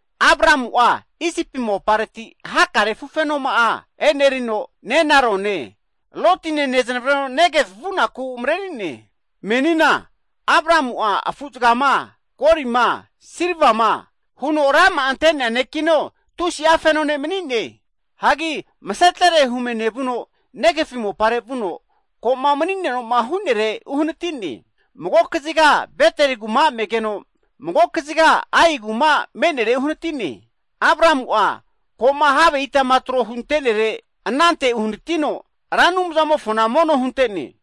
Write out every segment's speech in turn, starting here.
Abramu'a Isipi mopareti hakare afufenoma'a enerino nenarone, Lotine neznavreno Negev vu'naku mareri'ne. Menina Abramu'a afu'zagama, golima, silvama huno rama'a ante'nea ne'kino tusi'a feno ne' mani'ne. Hagi masetere hume nevuno, Negev mopare vuno ko'ma mani'neno'ma hu'nere uhanati'ne. Mago kaziga Beteli kuma me'negeno, mago kaziga Ai kuma me'nere uhanati'ne. Abramu'a ko'ma have itama tro hunte'nere anante uhanatino, Ra Anumzamofona mono hunte'ne.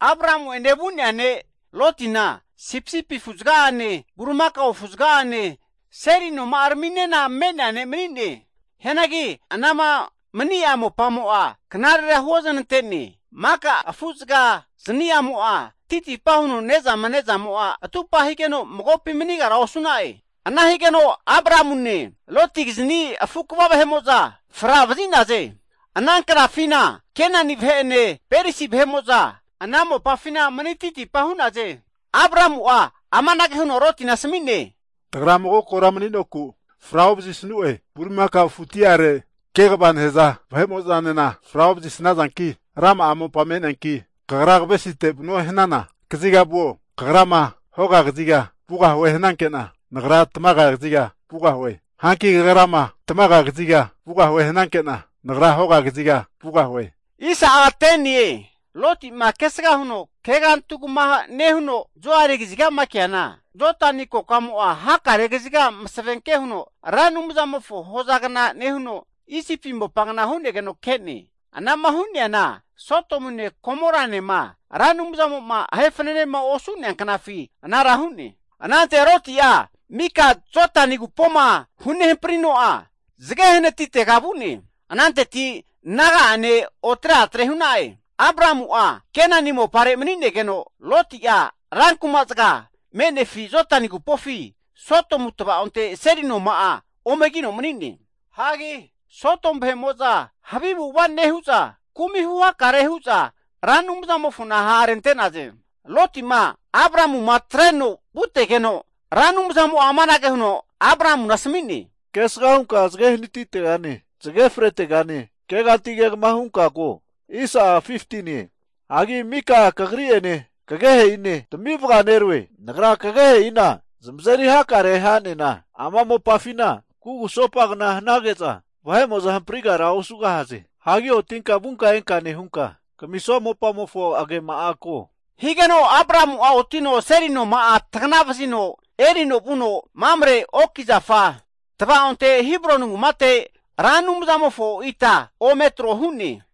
Abramu'ene vu'nea ne' Lotina sipisipi afu'zaga'ane, bulimakao afuzaga'ane seli noma'araminena me'nea ne' mani'ne. Hianagi anama mani'a mopamo'a knarera huozanante'ne. Maka afuzaga zani'amo'a titipa huno ne'zama ne'zamo'a atupa higeno, magopi manigara osu'na'e. Ana nehigeno Abramune, Lotikizni afu kva vahe'mo'za fra vazi'naze. Ana knafina Kenani vahe'ene, Perisi vahe'mo'za ana mopafina mani titipa hu'naze. Abramu'a amanage huno Lotina asami'ne, Tagra mago kora mani'noku fra ovazisnue, bulimakao afuti'are kegavama nehaza vahe'mo'zanena fra ovazisazanki, rama'a mopa me'neanki kagra kavesite vanuema hanana kaziga vuo. Kagrama hoga kaziga vugahue hananke'na, nagra tamaga kaziga vugahue. Hanki kagrama tamaga kaziga vugahue hananke'na, nagra hoga kaziga vugahue. Loti'ma kesga huno kegantugama nehuno Zoari kazigama keana, Jodani kokamo'a hakare kaziga masavenke huno Ra Anumzamofo Edeni hozagna nehuno, Isipi mopagna hu'negeno ke'ne. Anama hu'neana Sodomune, Gomoranema Ra Anumzamo'ma ahe fananema osu'nea knafi anara hu'ne. Anante Loti'a mika Jodani agupoma hunehamprino'a zage hanatitega vu'ne. Ananteti naga'ane otre atre hu'na'e. Abramu'a Kenani mopare manigeno, Loti'a ranku'ma zaga me'nefi Jodani agupofi Sodomu tva'onte seli noma'a omegino mani'ne. Sodomu vahe'mo'za havi avu'ava nehu'za kumi huhakare hu'za, Ra Anumzamofo ha' rente'naze. Loti'ma, Abramu'ma atreno vutegeno, Ra Anumzamo'a amanage huno Abramuna asami'ne, Kesga hunka zage hanatitegane, zage fretegane keganti kegama hunka ko. Hagi mika kagri'ene, kagehe'ine tami vaganeroe. Nagra kagehe'ina zamazeri hakare ha'nena, ama mopafina kugusopagna hanage'za, vahe'mo'zahamprigara osugahaze. Hagi otinka vunka enka nehunka, kamisua mopamofo agema'a ko. Higeno Abramu'a otino seli noma'a tagna vazino erino vuno Mamre me'nea oki zafa tavaonte Hebroni kumate, Ra Anumzamofo ita ome tro hu'ne.